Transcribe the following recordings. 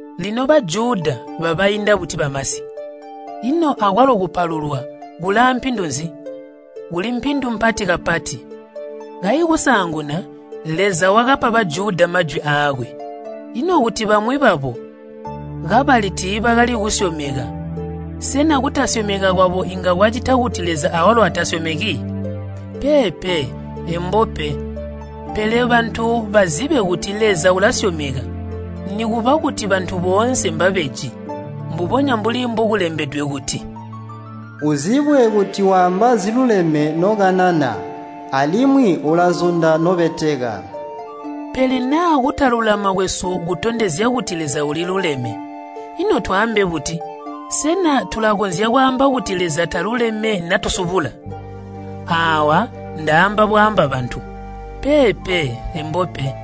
Lino Bajuda babainda buti bamasi? Ino akwalo kupalulwa kuli aampindu nzi? Kuli mpindu mpati kapati. Kayi kusaanguna, Leza wakapa Bajuda majwi aakwe. Ino kuti bamwi babo kabali tiibakali kusyomeka, sena kutasyomeka kwabo inga kwacita kuti Leza awalo atasyomeki? Peepe, embo pe! Pele bantu bazibe kuti Leza ulasyomeka, nikuba kuti bantu boonse mbabeji. Mbubonya mbuli mbokulembedwe kuti, “Uzibwe kuti waamba ziluleme nokanana, alimwi ulazunda nobeteka.” Pele naa kutalulama kwesu kutondezya kuti Leza uliluleme, ino twaambe buti? Sena tulakonzya kwaamba kuti Leza taluleme natusubula? Aawa ndaamba bwaamba bantu. Peepe, embo pe!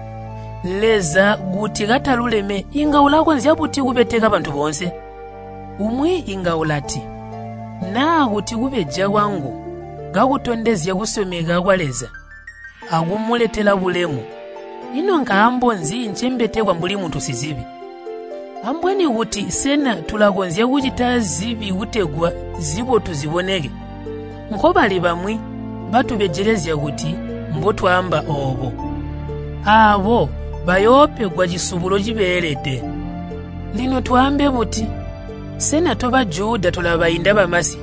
Leza kuti kataluleme inga ulakonzya buti kubeteka bantu boonse? Umwi inga ulati, “Naa kuti kubeja kwangu kakutondezya kusyomeka kwa Leza akumuletela bulemu, ino nkaambo nzi ncembetekwa mbuli muntu sizibi?” Ambweni kuti sena tulakonzya kucita zibi kutegwa zibotu ziboneke? Nkobali bamwi batubejelezya kuti mbotwaamba oobo. Aabo bayoopegwa cisubulo cibeelede. Lino twaambe buti? Sena to Bajuda tulabainda bamasi?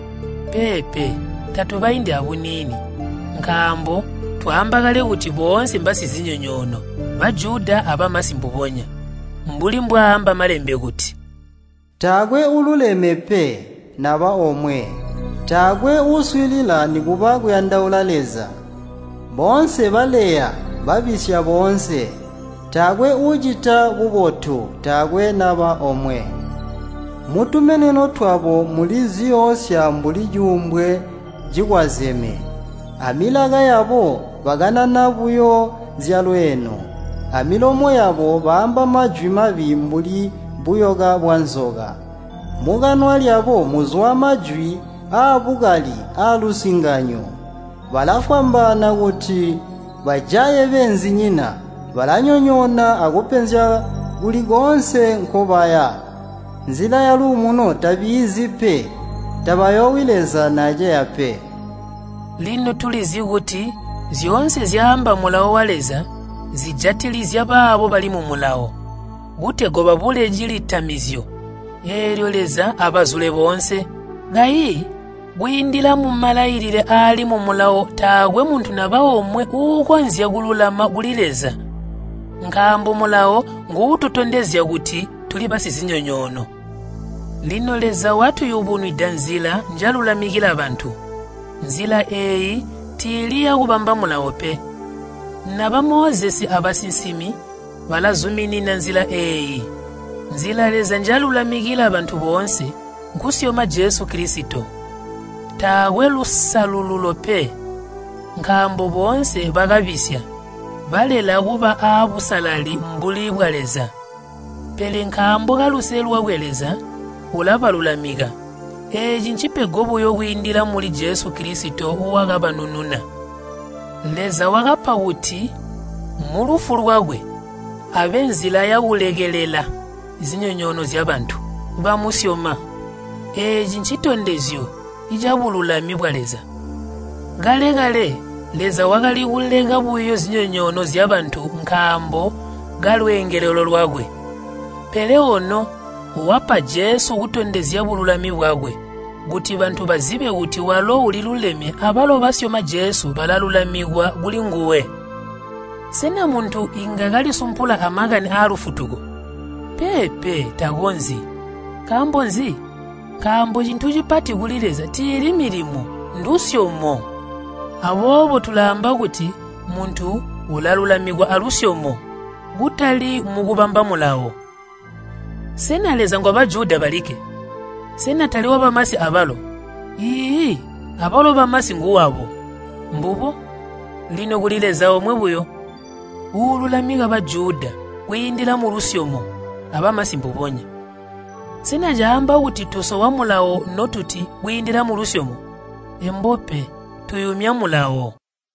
Peepe, tatubaindi abuniini, nkaambo twaamba kale kuti boonse mbaasizinyonyoono Bajuda abamasi mbubonya. Mbuli mbwaaamba Malembe kuti, “Taakwe uululeme pe, naba omwe. Taakwe uuswiilila nikuba kuyandaula Leza. Boonse baleya, babisya boonse. Taakwe uucita bubotu, taakwe naba omwe. Mutumeneno twabo muli ziyoosya mbuli cuumbwe cikwazeme. Amilaka yabo bakanana buyo zyalweeno. Amilomo yabo baamba majwi mabi mbuli buyoka bwanzoka. Mukanwa lyabo muzwa majwi aabukali aalusinganyo. Balafwambaana kuti bajaye beenzinyina. Balanyonyoona akupenzya kuli koonse nkobaya. Nzila yaluumuno tabiizi pe. Tabayoowi Leza naaceya pe.” Lino tulizi kuti zyoonse zyaamba Mulawo wa Leza zijatilizya baabo bali mu Mulawo, kutegwa babule cilitamizyo, eelyo Leza abazule boonse. Kayi kwiindila mumalailile aali mu Mulawo taakwe muntu naba omwe uukonzya kululama kuli Leza. Nkaambo Mulawo nguututondezya kuti tuli basizinyonyoono. Lino Leza watuyubunwida nzila njalulamikila bantu, nzila eeyi tiili yakubamba Mulawo pe. Naba Mozesi abasinsimi balazuminina anzila eeyi. Nzila Leza njalulamikila bantu boonse nkusyoma Jesu Kilisito. Taakwe lusalululo pe. Nkaambo boonse bakabisya, balela kuba aabusalali mbuli bwa Leza. Pele nkaambo kaluse lwakwe Leza ulabalulamika. Eeci ncipego buyo kwiindila muli Jesu Kilisito wakabanununa. Leza wakapa kuti mulufu lwakwe abe nzila yakulekelela zinyonyoono zyabantu bamusyoma. Eeci ncitondezyo cabululami bwa Leza. Kale-kale Leza wakali kuleka buyo zinyonyoono zyabantu nkaambo kalweengelelo lwakwe. Pele ono wapa Jesu kutondezya bululami bwakwe, kuti bantu bazibe kuti walo uliluleme abalo basyoma Jesu balalulamikwa kulinguwe. Sena muntu inga kalisumpula amakani alufutuko? Peepe, takonzyi. Nkaambo nzi? Nkaambo cintu cipati kuli Leza tiili milimo, ndusyomo. Aboobo tulaamba kuti muntu ulalulamikwa alusyomo, kutali mukubamba Mulawo. Sena Leza ngwa Bajuda balikke? Sena tali wabamasi abalo? Iiyi, abalo bamasi nguwabo. Mbubo, lino kuli Leza omwe buyo, uululamika Bajuda kwiindila mulusyomo, abamasi mbubonya. Sena caamba kuti tusowa Mulawo notuti kwiindila mulusyomo? Embo pe, tuyumya Mulawo.